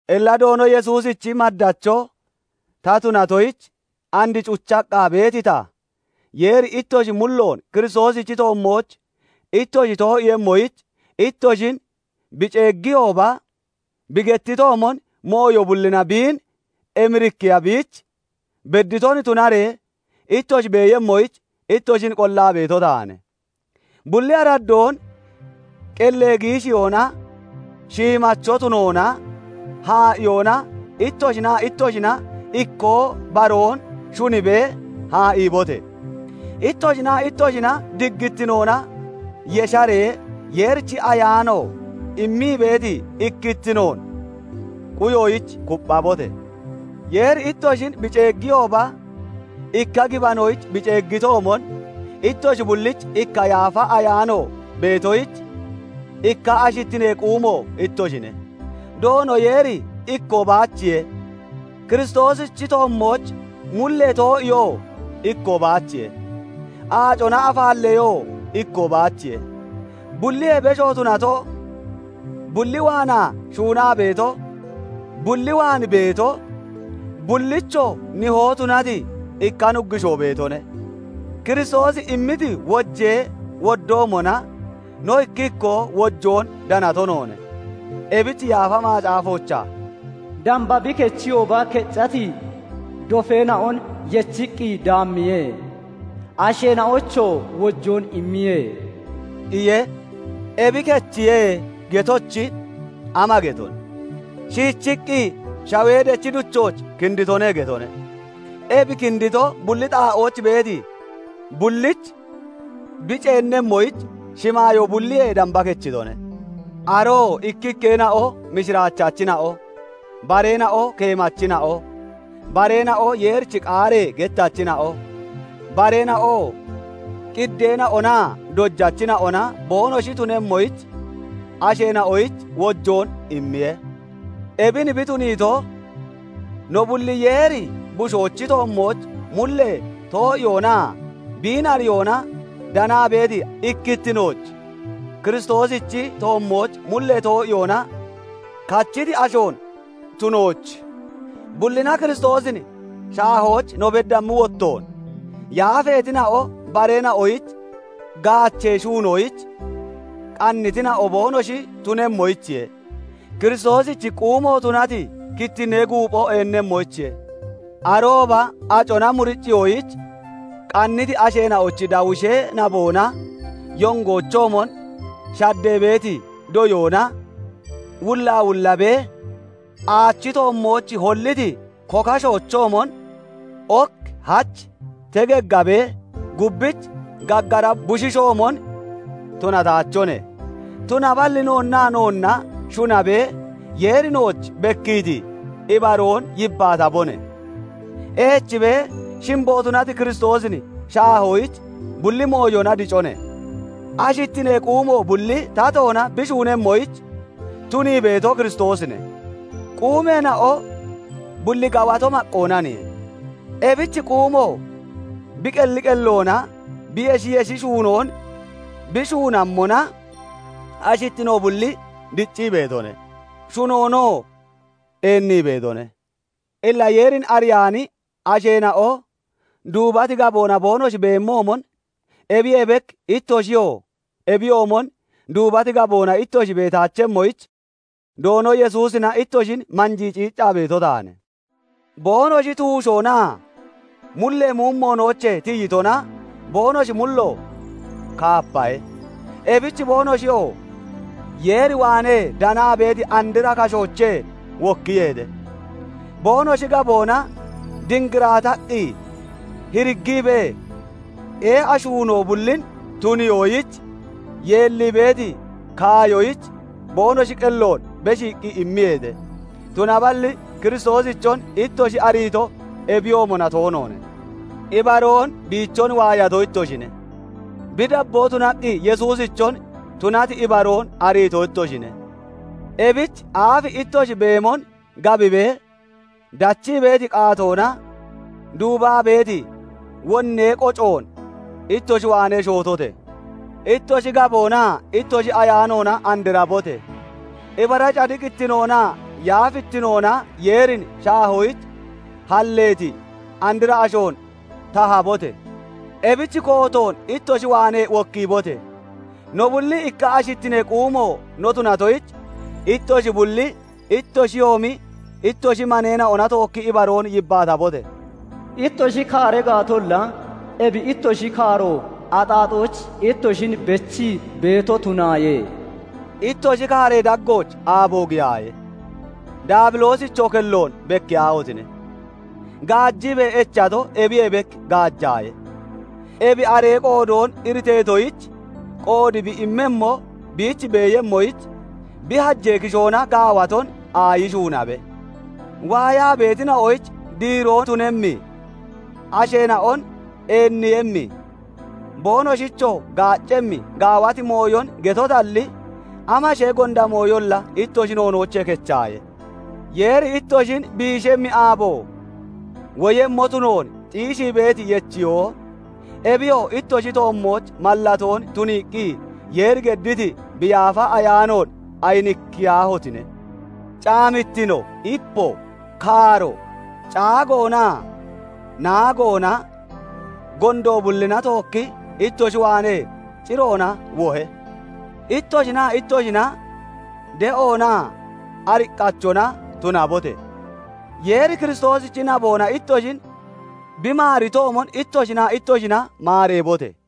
Illa Doono Yesuusichi maddacho ta tunatoyich and cuchaqqa beeti ta, Yeeri ittoshi mulloon Kiristoosichi toommooch ittoshi too'iiyemmoyich ittoshin bi ceeggiyooba bi gettitoomon, mooyo bullina biin emirikkiya biich bedditon tunaree ittoshi beeyemmoyich ittoshin qollaa beeto taane; bulli araddoon qellee giishiyoona, shiimacho tunoona, haa'iyoona ittoshinaa ittoshina ikkoo baroon shunibee haa'iibote! Ittoshinaa ittoshina diggittinoona yesharee Yeerichi Ayaano immii beeti ikkittinoon quyoyich kupphabote! Yeeri ittoshin bi ceeggiyooba ikka gibanoyich bi ceeggitoomon, ittoshi bullich ikka Yaafa Ayaano beetoyich ikka ashittinee quumo ittoshine. Doono Yeeri ikkoo baachiye; Kiristoosichi toommooch mullee too'iyoo ikkoo baachiye; aacona afaalleyoo ikkoo baachiye; bulliyee besho tunato, bulli waanaa shuunaa beeto, bulli waan beeto, bullichoo Nihoo tunati ikka Nuggushoo beetone. Kiristoosi immiti wojee woddoomona, no ikki ikkoo wojoon danato noone. Ebich Yaafa Macaafoochaa "Damba bi kechiyooba keccati dofeena'on yechiqqi daammiye; Asheena'oyichoo wojoon immiye" iye. Ebi "Kechiye" getochi, ama getone? Shiichiqqi shawee dechi duchooch "Kinditone" getone. Ebi kindito, bulli xaa'ooch beeti bulliich bi ceennemmoyich shimaayoo bulliyee damba kechitone. Aroo ikkikkeena'o mishiraachachina'o, bareena'o keemachina'o, bareena'o Yeerichi qaaree gettachina'o, bareena'oo qiddeena'onaa dojachina'ona boonoshi tunemmoyich asheena'oyich wojoon immiye. Ebin bi tuniito, no bulli Yeeri Bushoochi toommooch mullee too'iyoonaa biin ariyoona danaa beeti ikkittinooch, Kiristoosichi toommooch mullee too'iyoona kachiti ashoon tunooch, bullina Kiristoosin shaahooch no beddammi wottoon, yaafeetina'o bareena'oyich gaachee shuunoyich qannitina'o boonoshi tunemmoyichiye; Kiristoosichi quumo tunati kittinnee guuphoo eennemmoyichiye. Arooba acona muriciyoyich qanniti asheena'ochi dawushee naboona, yongoochoomon shaddee beeti doyoona wullaawullabee aachi toommooch holliti kokashoochoomon ok hach tegeggabee gubbich gaggara bushiishoomon tunataachone. Tunaballi noonnaa noonna shunabee Yeeri nooch bekkiiti ibaroon yibbaatabone; eechibee shimbo tunati Kiristoosin shaahoyich bulli mooyona dicone. Ashittinee quumo bulli tatoona bi shuunemmoyich tunii beeto Kiristoosine; quumeena'o bulli gawato maqqoonaniye; ebich quumo bi qelli qelloona bi yeshi yeshi shuunoon bi shuunammona ashittino bulli diccii beetone; shunoonoo eennii beetone. Illa Yeerin ariyaani asheena'o duubati gaboona boonoshi beemoomon, ebiyee bek ittoshiyoo ebiyoomon duubati gaboona ittoshi beetaachemmoyich Doono Yesuusina ittoshin manjii ciiccaa beeto taane. Boonoshi tuushoonaa mullee muumoonoochee tiyitona boonoshi mullo kaapahe; ebich boonoshiyoo Yeer waanee danaa beeti andra kashoochee wokkiyeete; boonoshi gaboona dingiraataqqi, hiriggiibee ee'a shuunoo bullin tuniyoyich yeellii beeti kaayoyich boonoshi qelloon beshiiqqi immiyeete. Tunaballi Kiristoosichon ittoshi ariito ebiyoomona toonoone; ibaroon biichon waayato ittoshine; bi dabboo tunaqqi Yesuusichon tunati ibaroon ariito ittoshine; ebich aafi ittoshi beemon gabibee dachii beeti qaatoona duubaa beeti wonnee qocoon ittoshi waanee shootote! Ittoshi gaboonaa ittoshi ayaanoona andrabote! Ibara cadiqittinoonaa yaafittinoona Yeerin shaahoyich halleeti andra ashoon tahabote! Ebich kootoon ittoshi waanee wokkiibote! No bulli ikka ashittinee quumo no tunatoyich, ittoshi bulli ittoshiyoomi ittoshi maneena'ona tookki ibaroon yibbaatabote! Ittoshi kaara gaatolla, ebi ittoshi kaaro axaaxooch ittoshin bechii beeto tunaaye; ittoshi kaaree daggooch aabo giyaaye. Daabiloosichoo kelloon bekkiyaahotine! Gaajiibee echato ebiyee bek gaajaaye; ebi aree qoodoon iriteetoyich qoodi bi immemmo biich beeyemmoyich, bi hajee kishoona gaawaton aayi shuunabe. Waayaa beetina'oyich diiroo tunemmi, aasheena'on eenniiyemmi, boonoshichoo gaaccemmi gaawati mooyon getotalli, amashee gonda mooyolla ittoshi noonoochee kechaaye. Yeeri ittoshin biishemmi aabo woyemmo tunoon xiishii beeti yechiyoo, ebiyoo ittoshi toommooch mallatoon tuniiqqi Yeeri gedditi bi Yaafa Ayaanoon ayinikkiyaahotine! Caamittino, ipo, kaaro, caagoonaa naagoona gondo bullina tookki ittoshi waanee ciroona wohe. Ittoshinaa ittoshina de'oonaa ariqqachona tunabote! Yeeri Kiristoosichi naboona ittoshin bi maaritoomon ittoshinaa ittoshina maareebote!